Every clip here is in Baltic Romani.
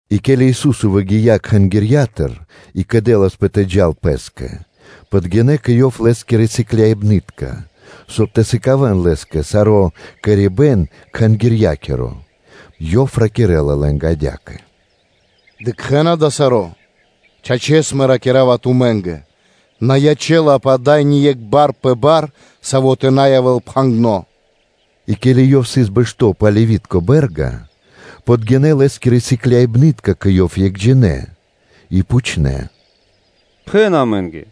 И ке́ли Ису́со выгия́ Кхангирья́тыр и кэдэласпэ тэ джал Пэ́скэ, подгинэ́ кэ Ёв Лэ́скирэ сыкляибны́тка, соб (кай) тэ сыкавэ́н Лэ́скэ саро́ кэрибэн Кхангирья́киро. Ёв ракирэ́ла лэ́нгэ адя́кэ: “Дыкхэ́на дава́ саро́? Чачэс, Мэ ракира́ва тумэ́нгэ: на ячэ́лапэ ада́й ни екх бар пэ бар, саво́ тэ на явэ́л пхагирдо́.” И ке́ли Ёв сыс бэшто́ пэ Оливи́тко бэ́рга, подгинэ́ Лэ́скирэ сыкляибны́тка кэ Ёв екхджинэ и пхучнэ́: “Пхэн амэ́нгэ,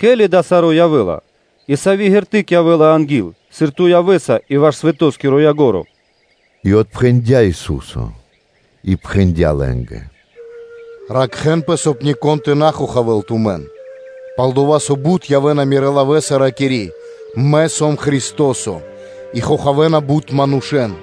ке́ли дава́ саро́ явэ́ла, и сави́ ґерты́к (знаме́ниё) явэ́ла анги́л, сыр Ту явэ́са и ваш свэтоскиро ко́нцо (яго́ро)?” И отпхэндя́ Ису́со и пхэндя́ лэ́нгэ: “Ракхэ́нпэ, соб (кай) нико́н тэ на хохавэ́л тумэн. Пал-дова́, со бут явэ́на Мирэ́ лавэ́са, ракири́: ‘Мэ сом Христо́со,’ и хохавэна бут манушэ́н.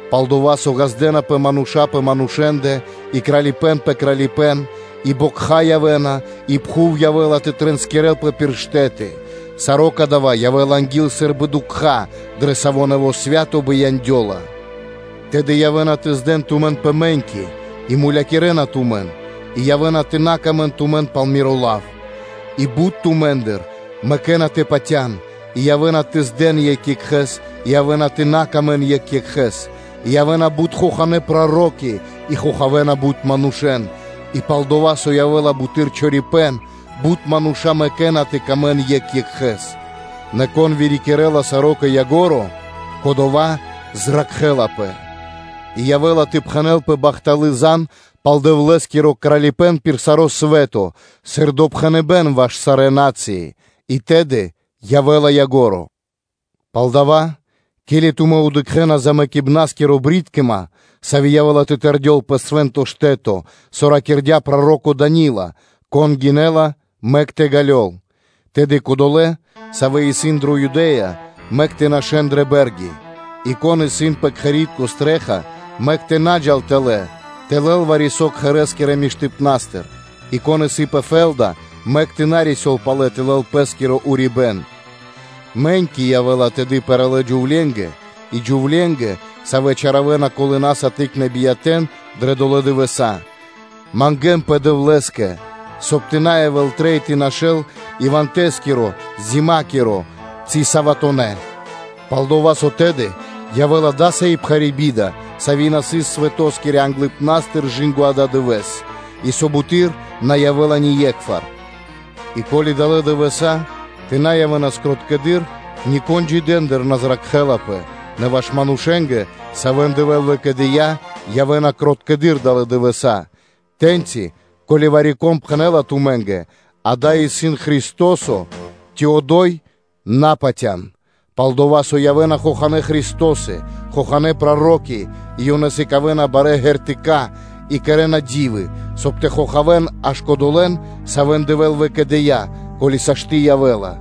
Пал-дова́ со ґаздэ́напэ мануша́ пэ манушэ́ндэ и кралипэ́н пэ кралипэ́н, и бокха явэ́на, и мэрибнытка фра́нсы и пхув явэ́ла тэ тринскирэлпэ пир штэ́ты. Саро́ кадава́ явэ́ла анги́л сы́рбы дукха́, дрэ саво́ нэво́ свэ́то бияндёла. Тэды явэ́на тэ здэн тумэн пэ мэ́ньки и мулякирэна тумэн, и явэ́на тэ на сыкавэ́н паты́в тумэ́нгэ пал Миро лав. И бут тумэ́ндыр мэкэ́на тэ патя́н, и явэ́на тэ здэн екх екхэ́с, и явэ́на тэ на сыкавэ́н паты́в екх екхэ́скэ; и явэ́на бут хоханэ́ проро́ки и хохавэна бут манушэ́н; и пал-дова́ со явэ́ла буты́р чорипэ́н, бут мануша́ мэкэ́на тэ сыкавэ́н паты́в екх екхэ́скэ. Нэ кон вырикирэ́ла саро́ кэ ко́нцо (кэ яго́ро), кодова́ зракхэ́лапэ. И явэ́ла тэ пхэнэлпэ бахталы́ зан (звесь) пал Дэвлэ́скиро Кралипэ́н пир саро́ свэ́то сыр допхэныбэ́н ваш сарэ́ на́цыи; и тэды явэ́ла ко́нцо (яго́ро)! Палдава́, ке́ли тумэ́ дыкхэ́на голотынякиро джунгалыпэ́н (брыткима), саво́ явэ́ла тэ тэрдёл пэ свэ́нто штэ́то, со ракирдя́ проро́ко Дание́лё, (кон гинэ́ла, мэк тэ ґалёл), тэды кодолэ́, савэ́ исын дрэ Юдэ́я, мэк тэ нашэ́н дрэ бэ́рги; и кон исын пэ кхэри́тко стрэ́ха (чхаки́н), мэк тэ на джал тэлэ́ тэ лэл вари-со кхэрэ́скирэ миштыпна́стыр, и кон исын пэ фэ́лда, мэк тэ на рисёл палэ тэ лэл пэ́скиро урибэ́н. Мэ́ньки явэ́на тэды пэралэ джувленгэ, и джувленгэ, савэ́ чаравэна колынэса тыкнэ́ биятэ́н дрэ долэ́ дывэса́. Мангэ́нпэ Дэвлэ́скэ, соб (кай) тэ на явэ́л трэй тэ нашэ́н иванта(тэс)киро (зимакиро) ци саватонэ́ (суботонэ́): пал-дова́ со тэды явэ́ла дасави́ биба́хт, сави́ на сыс свэто́скирэ англыпна́стыр, и со буты́р на явэ́ла ние́кхвар; И ко́ли далэ́ дывэса́ тэ на явэ́нас кроткэдыр, нико́н джидэндыр на зракхэласпэ; нэ ваш манушэ́нгэ, савэ́н Дэвэ́л выкэдыя́, явэ́на кроткэдыр далэ́ дывэса́. Тэ́ньци, ко́ли вари-кон пхэнэ́ла тумэ́нгэ: ‘Акэ, исын Христо́со’ ци ‘одо́й’, на патя́н. Пал-дова́ со явэ́на хоханэ́ христосы, хоханэ́ проро́ки и ёнэ сыкавэ́на барэ́ ґертыка́ и кэрэ́на ди́вы, соб (кай) тэ хохавэн аж кодолэ́н, савэ́н Дэвэ́л выкэдыя́, ко́ли сашты́ явэ́ла.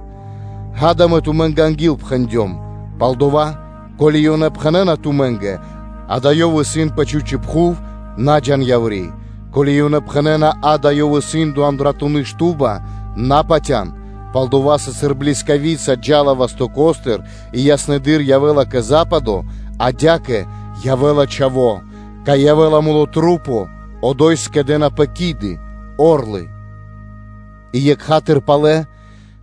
Акэ, Мэ тумэ́нгэ ангилпхэндём. Палдова́, ко́ли ёнэ пхэнэ́на тумэ́нгэ: ‘А́кэ, Ёв исын пэ чхучэ́ прахи’, на джа́н яври́; ко́ли ёнэ пхэнэ́на: ‘А́кэ, Ёв исын дро андратуны́ шту́ба’, на патя́н. Пал-дова́ со, сыр блискавица джа́ла вастоко́стыр и яснэдыр явэ́ла кэ западо, адя́кэ явэ́ла Чхаво́. Кай явэ́ла тру́по, одо́й скэдэ́напэ орлы (киды). И екха́тыр (сра́зу) пало́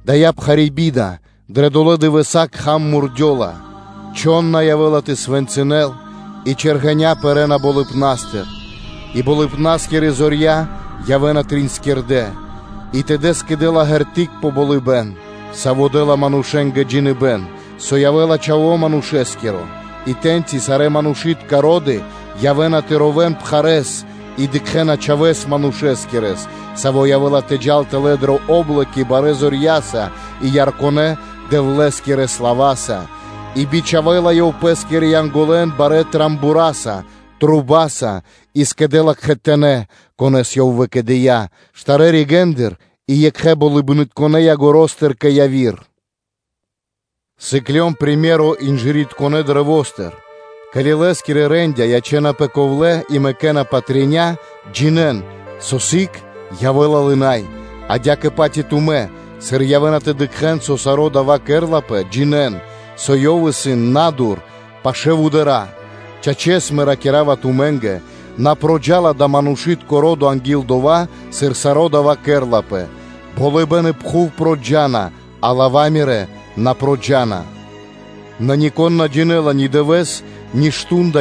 дая́ пхари́ би́да дрэ долэ́ дывэса́ кхам мурдёла, чхон на явэ́ла тэ свэнцынэл, и чэргэня́ пэрэ́на болыбна́стыр, и болыбна́скирэ зорья явэ́на триинскирдэ И тэды сыкадёла ґерты́к пэ болыбэ́н, сави́ дэ́ла манушэ́нгэ джиныбэ́н, со явэ́ла Чхаво́ Манушэ́скиро, и тэ́ньчи сарэ́ манушы́тка ро́ды явэ́на то ровэ́н пхарэ́с и дыкхэ́на Чхавэ́с Манушэскирэс, Саво́ явэ́ла тэ джал тэлэ́ дрэ о́блоки барэ́ зорья́са и ярконэ Дэвлэ́скирэ слава́са. И бичхавэ́ла Ёв Пэ́скирэ Янголэн барэ́ рогоса (трубаса), и скэдэ́ла кхэтанэ́, конэ́с Ёв выкэдыя́, штарэ́ ригэ́ндыр и екхэ болыбнытконэ ягоро́стыр (краёстыр) кэ яви́р. Сыклён сыкаибэ́н (приме́ро) инжыритконэ каштэ́стыр: ке́ли лэ́скирэ рандя́ (вэ́тки) ячэ́напэ ковлэ́ и мэкэ́на патря (листы), джинэ́н, со сыг явэ́ла лынай. Адя́кэ-паць и тумэ́, сыр явэ́на тэ дыкхэ́н, со саро́ дава́ кэрэ́лапэ, джинэ́н, со Ёв исын на́дур, пашы́л вудара́. Чачэс, Мэ ракира́ва тумэ́нгэ: на проджа́ла дава́ манушы́тко ро́до анги́л дова́, сыр саро́ дава́ кэрэ́лапэ. Болыбэ́н и пхув проджа́на, а лава́ Мирэ́ на проджа́на. Нико́н на Джинэ́ла ни Дывэ́с, ни Мардо́ (Шту́нда)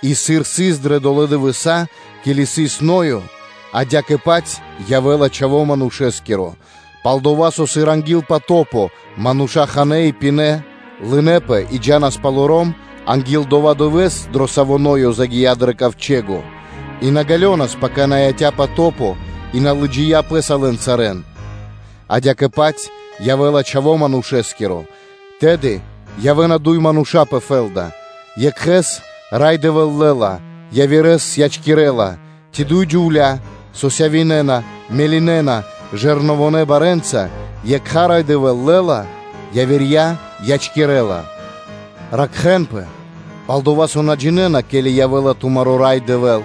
И, сыр сыс дрэ долэ́ дывэса́, ке́ли сыс Ноё, адя́кэ-паць явэ́ла Чхаво́ Манушэ́скиро. Палдава́ со, сыр анги́л потопо мануша́ ханэ́ и пинэ́, лынэпэ и джа́нас палоро́м анги́л дова́ дывэ́с, дро саво́ Ноё загия́ дро ковчэго, и на ґалёнас, пака яця́ патопо и на лыджыя пэ́са лэн сарэ́н, адя́кэ-паць явэ́ла Чхаво́ Манушэ́скиро. Тэды явэ́на дуй мануша́ пэ фэ́лда: екхэ́с Рай Дэвэ́л лэ́ла, явирэ́с ячкирэ́ла, ци дуй джувля́, со мелинэна жэрновонэ барэ́нца (бэлэдиненца): екха Рай Дэвэ́л лэ́ла, явирья ячкирэ́ла. Ракхэ́нпэ, пал-дова́ со на джинэ́на, ке́ли явэ́ла тумаро́ Рай Дэвэ́л.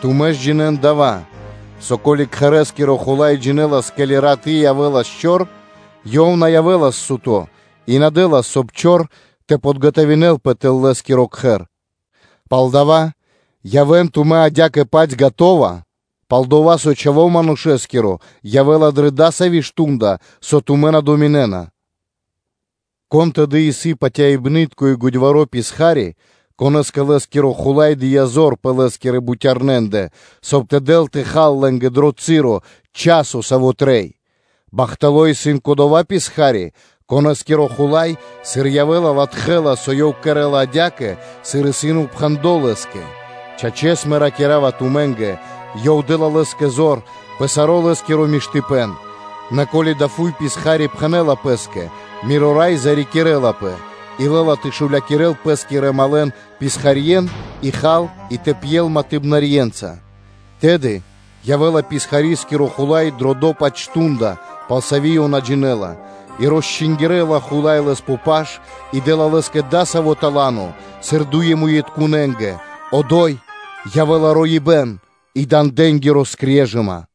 Тумэ́ ж джинэ́н дава́, со, ко́ли кхэрэ́скиро хула́й джинэлас, ке́ли раты́ явэ́ла чор, ёв на явэ́лас суто́ и на дэ́лас, соб (кай) чор тэ под΄ганавэлпэ тэл лэ́скиро кхэр. Палдава́ явэ́н тумэ́ адя́кэ-паць скэдынэ́, пал-дова́ со Чхаво́ Манушэ́скиро явэ́ла дрэ дасаво мардо́ (шту́нда), со тумэ́ на думинэ́на. Кон тэды исын патяибны́тко и годьваро́ писха́ри (ра́бо), конэ́скэ лэ́скиро хула́й дыя́ зор пэ лэ́скирэ бутярнэндэ, соб (кай) тэ дэл тэ хал лэ́нгэ дро часо, саво́ трэй? Бахтало́ исын кодова́ писха́ри, конэ́скиро хула́й, сыр явэ́ла, латхэ́ла, со ёв кэрэ́ла адя́кэ, сыр исын упхэндло́ лэ́скэ. Чачэс, Мэ ракира́ва тумэ́нгэ: ёв дэ́ла лэ́скэ зор пэ саро́ лэ́скиро миштыпэ́н. Нэ ко́ли адава́ фуй писха́ри пхэнэ́ла пэ́скэ: ‘Миро рай зарикирэлапэ’, и лэ́ла тэ шулякирэл пэ́скирэ малэн-писхарье́н, и хал и тэ пьел матыбнарьенца, тэды явэ́ла писхарискиро хула́й дро дова́-паць мардо́ (шту́нда), пал саво́ ёв на джинэ́ла, и росчингирэла хула́й лэс пэ паш и дэ́ла лэ́скэ дасаво тала́но, сыр дуе́муитконэнгэ: одо́й явэ́ла роибэ́н и дандэнгири скрежыма.